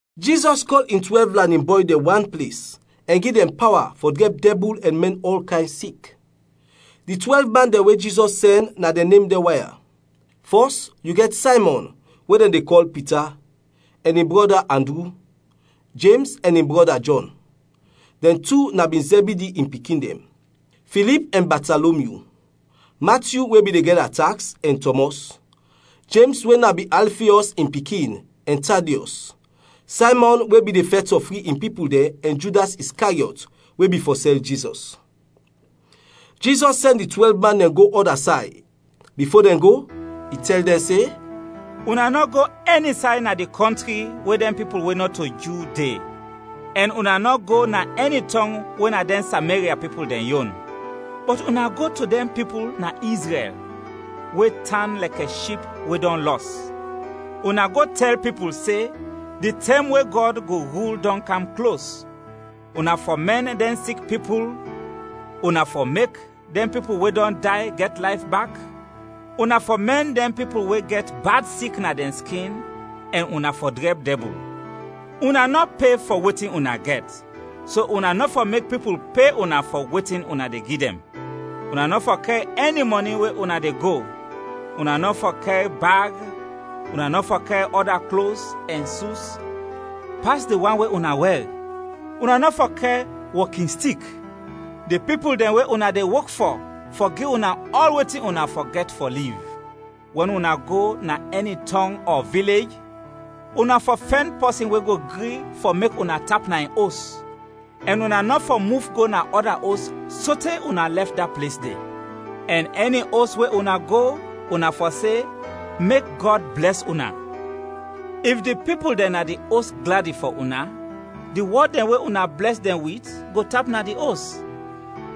Jizɔs kɔl in twɛlv lanin bɔy dɛn wan ples ɛn gi dɛn pawa fɔ drɛb dɛbul ɛn mɛn ɔl kayn sik. Di twɛlv man dɛn we Jizɔs sɛn na dɛn nem dɛn wan ya: Fɔs, yu gɛt Saymɔn we dɛn de kɔl Pita, ɛn in brɔda Andru; Jems, ɛn in brɔda Jɔn, dɛn tu na bin Zɛbidi in pikin dɛn; Filip ɛn Batalomyu; Matyu we bin de gɛda taks, ɛn Tɔmɔs; Jems we na bin Alfiɔs in pikin, ɛn Tadiɔs; Saymɔn we bin de fɛt fɔ fri in pipul dɛn, ɛn Judas Iskariɔt, we bin fɔ sɛl Jizɔs. Jizɔs sɛn di twɛlv man dɛn go ɔda say. Bifo dɛn go, i tɛl dɛn se, “Una nɔ go ɛni say na di kɔntri we dɛn pipul we nɔto Ju, de, ɛn una nɔ go na ɛni tɔng we na dɛn Sameria pipul dɛn yon. Bɔt una go to dɛn pipul na Izrɛl, we tan lɛkɛ ship we dɔn lɔs. Una go tɛl pipul se, di tɛm we Gɔd go rul dɔn kam klos! Una fɔ mɛn dɛn sik pipul, una fɔ mek dɛn pipul we dɔn day gɛt layf bak, una fɔ mɛn dɛn pipul we gɛt dɛn bad sik na dɛn skin ɛn una fɔ drɛb dɛbul. Una nɔ pe fɔ wetin una gɛt, so una nɔ fɔ mek pipul pe una fɔ wetin una de gi dɛn. Una nɔ fɔ kɛr ɛni mɔni we una de go; una nɔ fɔ kɛr bag, una nɔ fɔ kɛr ɔda klos ɛn sus pas di wan we una wɛr, una nɔ fɔ kɛr wɔkinstik. Di pipul dɛn we una de wok fɔ, fɔ gi una ɔl wetin una fɔ gɛt fɔ liv. “Wɛn una go na ɛni tɔng ɔ vilej, una fɔ fɛn pɔsin we go gri fɔ mek una tap na in os, ɛn una nɔ fɔ muf go na ɔda os sote una lɛf da ples de. Ɛn ɛni os we una go, una fɔ se, ‘Mek Gɔd blɛs una.’ If di pipul dɛn na di os gladi fɔ una, di wɔd dɛn we una blɛs dɛn wit, go tap na di os;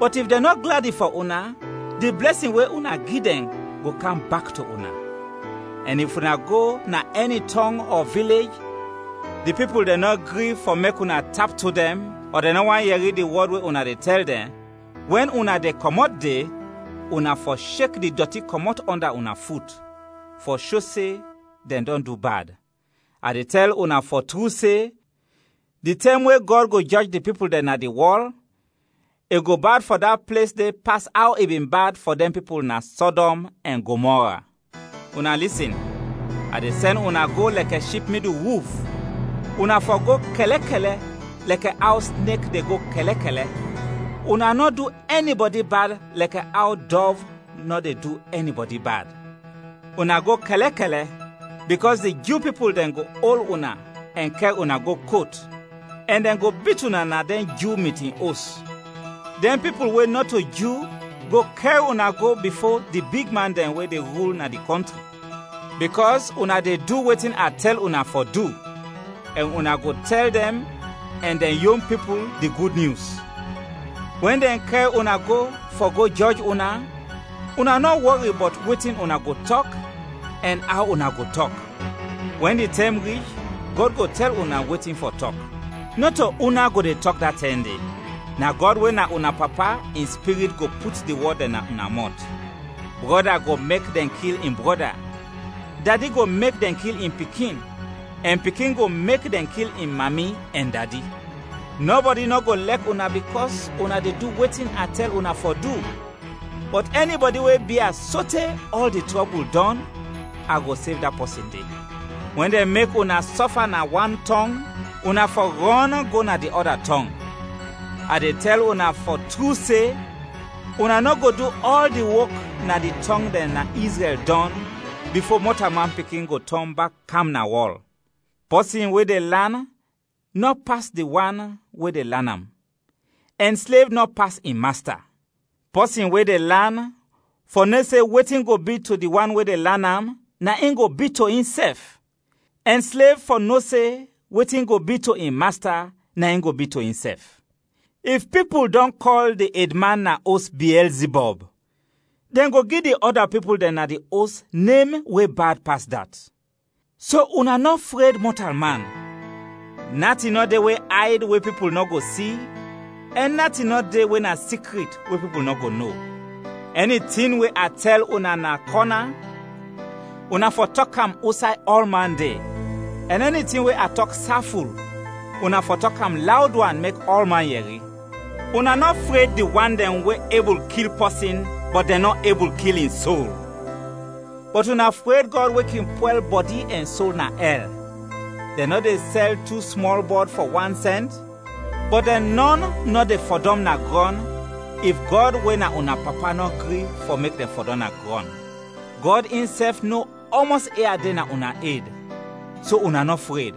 bɔt if dɛn nɔ gladi fɔ una, di blɛsin we una gi dɛn go kam bak to una. Ɛn if una go na ɛni tɔng ɔ vilej, di pipul dɛn nɔ gri fɔ mek una tap to dɛn, ɔ dɛn nɔ want yɛri di wɔd we una de tɛl dɛn, wɛn una de kɔmɔt de, una fɔ shek di dɔti kɔmɔt ɔnda una fut, fɔ sho se dɛn dɔn du bad. A de tɛl una fɔ tru se, di tɛm we Gɔd go jɔj di pipul dɛn na di wɔl, i go bad fɔ da ples de pas aw i bin bad fɔ dɛn pipul na Sɔdɔm ɛn Gomɔra. “Una lisin, a de sɛn una go lɛkɛ ship midul wulf; una fɔ go kɛlɛkɛlɛ lɛkɛ aw snek de go kɛlɛkɛlɛ, una nɔ du ɛnibɔdi bad lɛkɛ aw dɔv nɔ de du ɛnibɔdi bad. Una go kɛlɛkɛlɛ, bikɔs di Ju pipul dɛn go ol una ɛn kɛr una go kot, ɛn dɛn go bit una na dɛn Ju mitin os. Dɛn pipul we nɔto Ju go kɛr una go bifo di bigman dɛn we de rul na di kɔntri, bikɔs una de du wetin a tɛl una fɔ du, ɛn una go tɛl dɛn ɛn dɛn yon pipul di Gud Nyus. Wɛn dɛn kɛr una go fɔ go jɔj una, una nɔ wɔri bɔt wetin una go tɔk, ɛn aw una go tɔk. Wɛn di tɛm rich Gɔd go tɛl una wetin fɔ tɔk. Nɔto una go de tɔk da tɛm de, na Gɔd we na una Papa in Spirit go put di wɔd dɛn na una mɔt. “Brɔda go mek dɛn kil in brɔda, dadi go mek dɛn kil in pikin, ɛn pikin go mek dɛn kil in mami ɛn dadi. Nɔbɔdi nɔ go lɛk una bikɔs una de du wetin a tɛl una fɔ du, bɔt ɛnibɔdi we bia sote ɔl di trɔbul dɔn, a go sev da pɔsin de. Wɛn dɛn mek una sɔfa na wan tɔng, una fɔ rɔn go na di ɔda tɔng. A de tɛl una fɔ tru se, una nɔ go du ɔl di wok na di tɔng dɛn na Izrɛl dɔn bifo Mɔtalman Pikin go tɔn bak kam na wɔl. “Pɔsin we de lan nɔ pas di wan we de lan am, ɛn slev nɔ pas in masta. Pɔsin we de lan fɔ no se wetin go bi to di wan we lan am, na in go bi to insɛf; ɛn slev fɔ no se wetin go bi to in masta, na in go bi to insɛf. If pipul dɔn kɔl di edman na os Biɛlzibɔb, dɛn go gi di ɔda pipul dɛn na di os nem we bad pas dat. “So una nɔ fred mɔtalman, natin nɔ de we ayd, we pipul nɔ go si, ɛn natin nɔ de we na sikrit, we pipul nɔ go no. Ɛni tin we a tɛl una na kɔna, una fɔ tɔk am usay ɔlman de, ɛn ɛni tin we a tɔk saful, una fɔ tɔk am lawd wan mek ɔlman yɛri. Una nɔ fred di wan dɛn we ebul kil pɔsin, bɔt dɛn nɔ ebul kil in sol; bɔt una fred Gɔd we kin pwɛl bɔdi ɛn sol na ɛl. Dɛn nɔ de sɛl tu smɔl bɔd fɔ wan sɛnt? Bɔt dɛn nɔn nɔ de fɔdɔm na grɔn if Gɔd we na una Papa nɔ gri fɔ mek dɛn fɔdɔm na grɔn. Gɔd insɛf no ɔmɔs ia de na una ed, so una nɔ fred;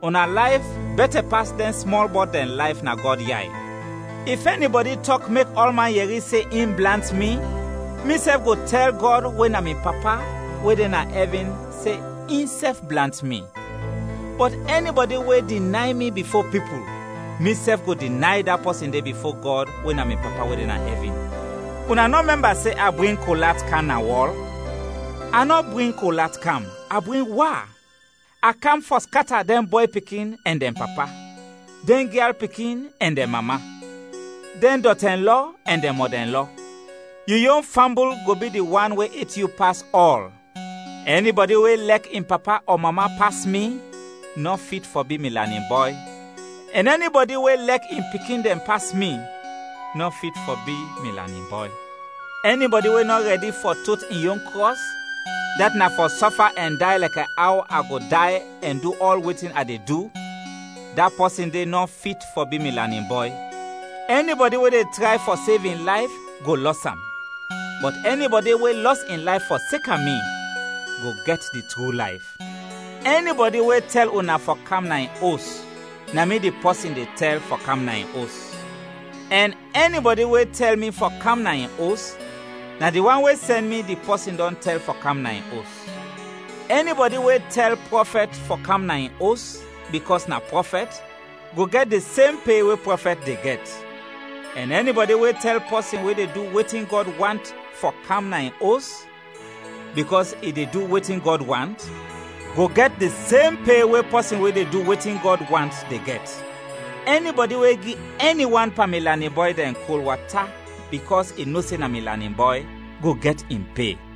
una layf bɛtɛ pas dɛn smɔl bɔd dɛn layf na Gɔd yay. “If ɛnibɔdi tɔk mek ɔlman yɛri se in blant mi, misɛf go tɛl Gɔd we na mi Papa we de na ɛvin se insɛf blant mi. Bɔt ɛnibɔdi we dinay mi bifo pipul, misɛf go dinay da pɔsin de bifo Gɔd we na mi Papa we de na ɛvin. “Una nɔ mɛmba se a bring kol at kam na wɔl, a nɔ bring kol at kam, a bring wa. A kam fɔ skata dɛn bɔy pikin ɛn dɛn papa, dɛn gyal pikin ɛn dɛn mama, dɛn dɔtɛnlɔ ɛn dɛn mɔdɛnlɔ; yu yon fambul go bi di wan we et yu pas ɔl. “Ɛnibɔdi we lɛk in papa ɔ mama pas mi, nɔ fit fɔ bi mi lanin bɔy, ɛn ɛnibɔdi we lɛk in pikin dɛn pas mi, nɔ fit fɔ bi mi lanin bɔy. Ɛnibɔdi we nɔ rɛdi fɔ tot in yon krɔs, dat na fɔ sɔfa ɛn day lɛkɛ aw a go day ɛn du ɔl wetin a de du, da pɔsin de nɔ fit fɔ bi mi lanin bɔy. Ɛnibɔdi we de tray fɔ sev in layf, go lɔs am; bɔt ɛnibɔdi we lɔs in layf fɔseka mi, go gɛt di tru layf. “Ɛnibɔdi we tɛl una fɔ kam na in os, na mi di pɔsin de tɛl fɔ kam na in os; ɛn ɛnibɔdi we tɛl mi fɔ kam na in os, na di wan we sɛn mi, di pɔsin dɔn tɛl fɔ kam na in os. Ɛnibɔdi we tɛl prɔfɛt fɔ kam na in os, bikɔs na prɔfɛt, go gɛt di sem pe we prɔfɛt de gɛt. Ɛn ɛnibɔdi we tɛl pɔsin we de du wetin Gɔd want fɔ kam na in os, bikɔs i de du wetin Gɔd want, go gɛt di sem pe we pɔsin we de du wetin Gɔd want de gɛt. Ɛnibɔdi we gi ɛni wan pan mi lanin bɔy dɛn kol wata bikɔs i no se na mi lanin bɔy, go gɛt in pe.”